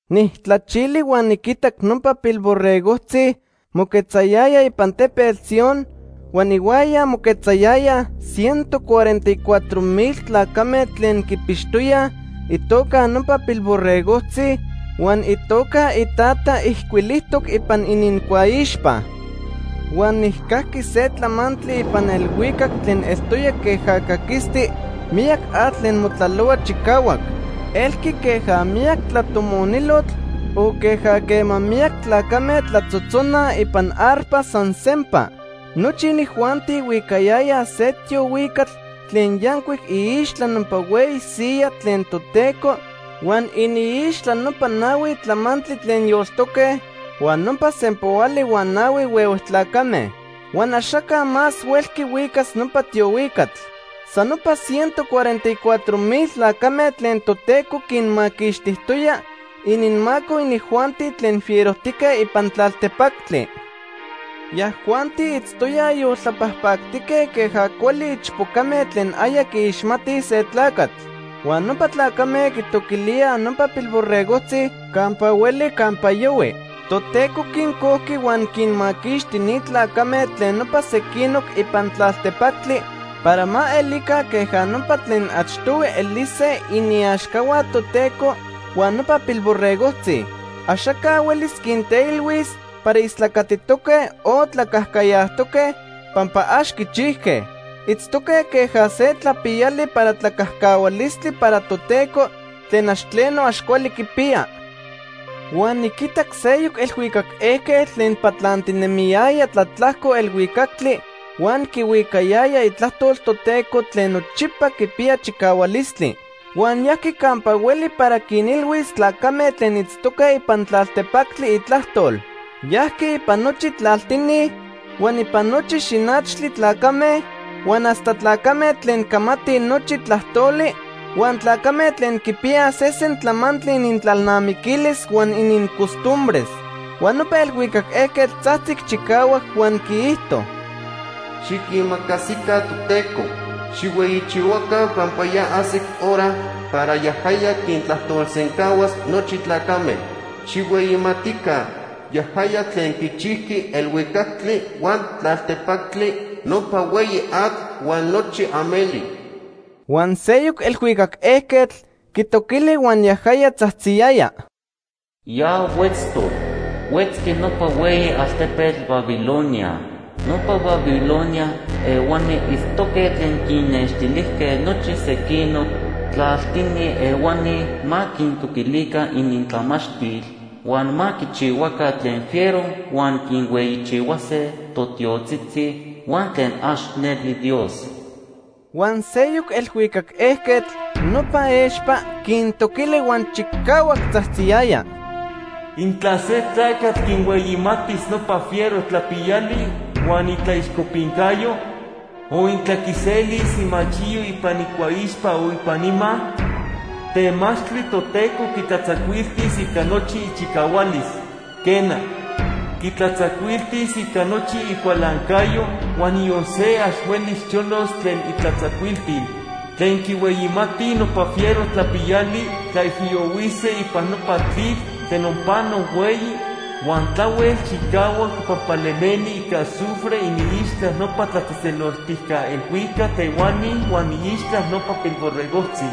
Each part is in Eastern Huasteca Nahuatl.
Nijtlachili huan niquitac nopa Pilborregojtzi moquetzayaya ipan Tepetl Sion huan ihuaya moquetzayayaj ciento cuarenta y cuatro mil tlacame tlen quipixtoyaj itoca nopa Pilborregojtzi huan itoca iTata ijcuilijtoc ipan inincuaixpa. Huan nijcajqui se tlamantli ipan elhuicac tlen eltoya queja caquisti miyac atl tlen motlalohua chicahuac. Elqui queja miyac tlatomonilotl, o queja quema miyac tlacame tlatzotzonaj ipan arpas san sempa. Nochi inijuanti huicayayaj se tiohuicatl tlen yancuic iixtla nopa hueyi siyaj tlen Toteco huan iniixtla nopa nahui tlamantli tlen yoltoque huan nopa sempoali huan nahui huehue tlacame. Huan axaca más huelqui huicas nopa tiohuicatl. San nopa ciento cuarenta y cuatro mil tlacame tlen Toteco quinmaquixtijtoya ininmaco inijuanti tlen fierojtique ipan tlaltepactli. Yajuanti itztoyaj yoltlapajpactique queja cuali ichpocame tlen aya quiixmatij se tlacatl. Huan nopa tlacame quitoquilíaj nopa Pilborregojtzi campa hueli campa yohui. Toteco quincojqui huan quinmaquixti ni tlacame tlen nopa sequinoc ipan tlaltepactli para ma elica queja nopa tlen achtohui elise iniaxcahua Toteco huan nopa Pilborregojtzi. Axaca huelis quinteilhuis para istlacatitoque o tlacajcayajtoque pampa ax quichijque. Itztoque queja se tlapiyali para tlacajcahualistli para Toteco tlen ax tleno ax cuali quipiya. Huan niquitac seyoc elhuicac ejquetl tlen patlantinemiyaya tlatlajco elhuicactli huan quihuicayaya itlajtol Toteco tlen nochipa quipiya chicahualistli. Huan yajqui campa hueli para quinilhuis tlacame tlen itztoque ipan tlaltepactli itlajtol. Yajqui ipan nochi tlaltini, huan ipan nochi xinachtli tlacame, huan hasta tlacame tlen camatij nochi tlajtoli, huan tlacame tlen quipiyaj sesen tlamantli inintlalnamiquilis huan inincostumbres. Huan nopa elhuicac ejquetl tzajtzic chicahuac huan quiijto: “Xiquimacasica Toteco. Xijhueyichihuaca pampa ya ajsic hora para yajaya quintlajtolsencahuas nochi tlacame. Xijhueyimatica yajaya tlen quichijqui elhuicactli huan tlaltepactli, nopa hueyi atl huan nochi ameli.” Huan seyoc elhuicac ejquetl quitoquili huan yajaya tzajtziyaya: “Ya huetztoc. Huetzqui nopa hueyi altepetl Babilonia. Nopa Babilonia ehuani itztoque tlen quinnextilijque nochi sequinoc tlaltini ehuani ma quintoquilica inintlamachtil, huan ma quichihuaca tlen fiero huan quinhueyichihuase totiotzitzi huan tlen ax neli Dios.” Huan seyoc elhuicac ejquetl, nopa expa, quintoquili huan chicahuac tzajtziyaya: “Intla se tlacatl quinhueyimatis nopa fiero tlapiyali huan itlaixcopincayo, o intla quiselis imachiyo ipan icuaixpa o ipan ima, temachtli Toteco quitlatzacuiltis ica nochi ichicahualis. Quena, quitlatzacuiltis ica nochi icualancayo, huan niyon se ax huelis cholos tlen itlatzacuiltil. Tlen quihueyimati nopa fiero tlapiyali tlaijiyohuise ipan nopa tlitl tlen onpano hueyi huan tlahuel chicahuac pampa lemeni ica azufre iniixtla nopa tlatzejtzeloltijca elhuicac ehuani huan iixtla nopa Pilborregojtzi.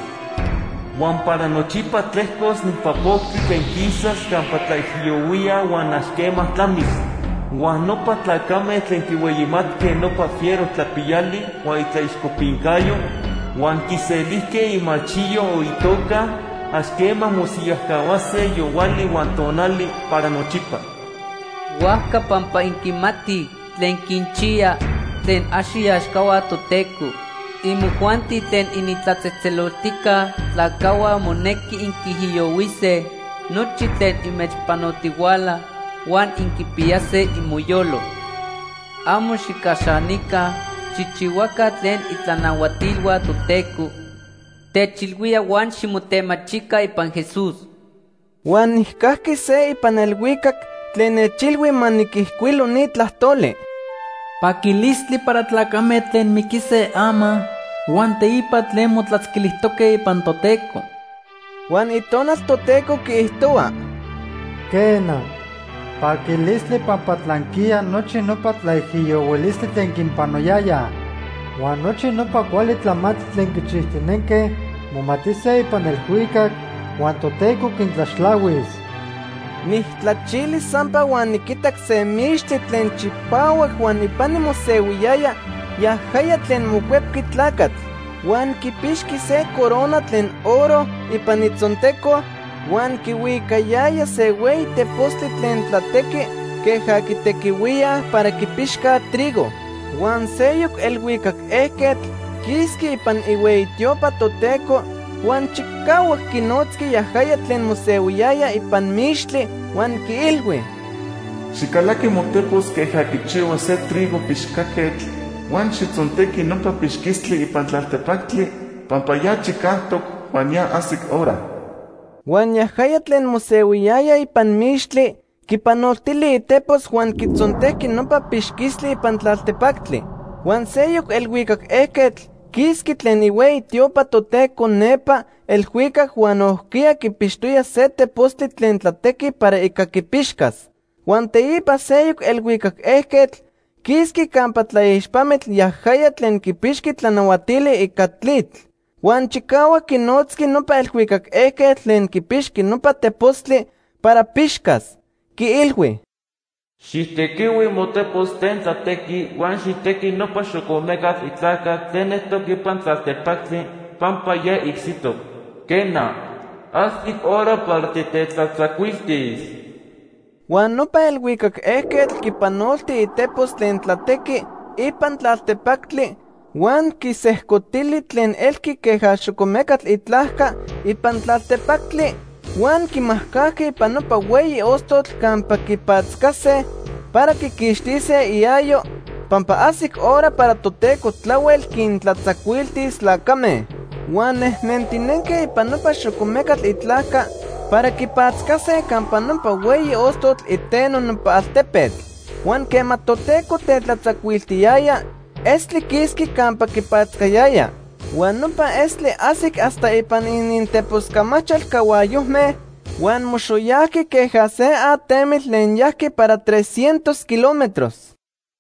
Huan para nochipa tlejcos nopa poctli tlen quisas campa tlaijiyohuíaj huan ax quema tlamis. Huan nopa tlacame tlen quihueyimatque nopa fiero tlapiyali huan itlaixcopincayo, huan quiselijque imachiyo o itoca, ax quema mosiyajcahuase yohuali huan tonali para nochipa.” Huajca pampa inquimatij tlen quinchiya tlen ax iaxcahua Toteco, imojuanti tlen initlatzejtzeloltijca tlacajhua monequi inquiijiyohuise nochi tlen inmechpanotihuala huan inquipiyase imoyolo. Amo xijcaxanica xijchihuaca tlen itlanahuatilhua Toteco techilhuíaj huan ximotemachica ipan Jesús. Huan nijcajqui se ipan elhuicac tlen nechilhui ma niquijcuilo ni tlajtoli: “Paquilistli para tlacame tlen miquise ama huan teipa tlen motlatzquilijtoque ipan Toteco.” Huan Itonal Toteco quiijtohua: “Quena, paquilistli pampa tlanquiya nochi nopa tlaijiyohuilistli tlen quinpanoyayaj. Huan nochi nopa cuali tlamantli tlen quichijtinenque momatise ipan elhuicac, huan Toteco quintlaxtlahuis.” Nijtlachili sampa huan niquitac se mixtli tlen chipahuac huan ipani mosehuiyaya yajaya tlen Mocuepqui Tlacatl. Huan quipixqui se corona tlen oro ipan itzonteco huan quihuicayaya se hueyi tepostli tlen tlatequi queja quitequihuíaj para quipixcaj trigo. Huan seyoc elhuicac ejquetl quisqui ipan ihueyi tiopa Toteco huan chicahuac quinotzqui yajaya tlen mosehuiyaya ipan mixtli, huan quiilhui: “Xijcalaqui motepos queja quichihua se trigo pixcaquetl huan xijtzontequi nopa pixquistli ipan tlaltepactli, pampa ya chicajtoc huan ya ajsic hora.” Huan yajaya tlen mosehuiyaya ipan mixtli quipanoltili itepos huan quitzontejqui nopa pixquistli ipan tlaltepactli. Huan seyoc elhuicac ejquetl quisqui tlen ihueyi tiopa Toteco nepa elhuicac huan nojquiya quipixtoya se tepostli tlen tlatequi para ica pixcas. Huan teipa seyoc elhuicac ejquetl quisqui campa tlaixpamitl, yajaya tlen quipixqui tlanahuatili ica tlitl. Huan chicahuac quinotzqui nopa elhuicac ejquetl tlen quipixqui nopa tepostli para pixcas. Quiilhui: “Xijtequihui motepos tlen tlatequi huan xijtequi nopa xocomecatl itlajca tlen eltoc ipan tlaltepactli, pampa ya icsitoc. Quena, ajsic hora para titetlatzacuiltis.” Huan nopa elhuicac ejquetl quipanolti itepos tlen tlatequi ipan tlaltepactli huan quisejcotili tlen elqui queja xocomecatl itlajca ipan tlaltepactli huan quimajcajqui ipan nopa hueyi ostotl campa quipatzcase para quiquixtise iayo, pampa ajsic hora para Toteco tlahuel quintlatzacuiltis tlacame. Huan nejnentinenque ipan nopa xocomecatl itlajca para quipatzcase campa nopa hueyi ostotl iteno nopa altepetl. Huan quema Toteco tetlatzacuiltiyaya, estli quisqui campa quipatzcayaya. Huan nopa estli ajsic hasta ipan ininteposcamachal cahuayojme huan moxoyajqui queja se atemitl tlen yajqui para tres cientos kilómetros.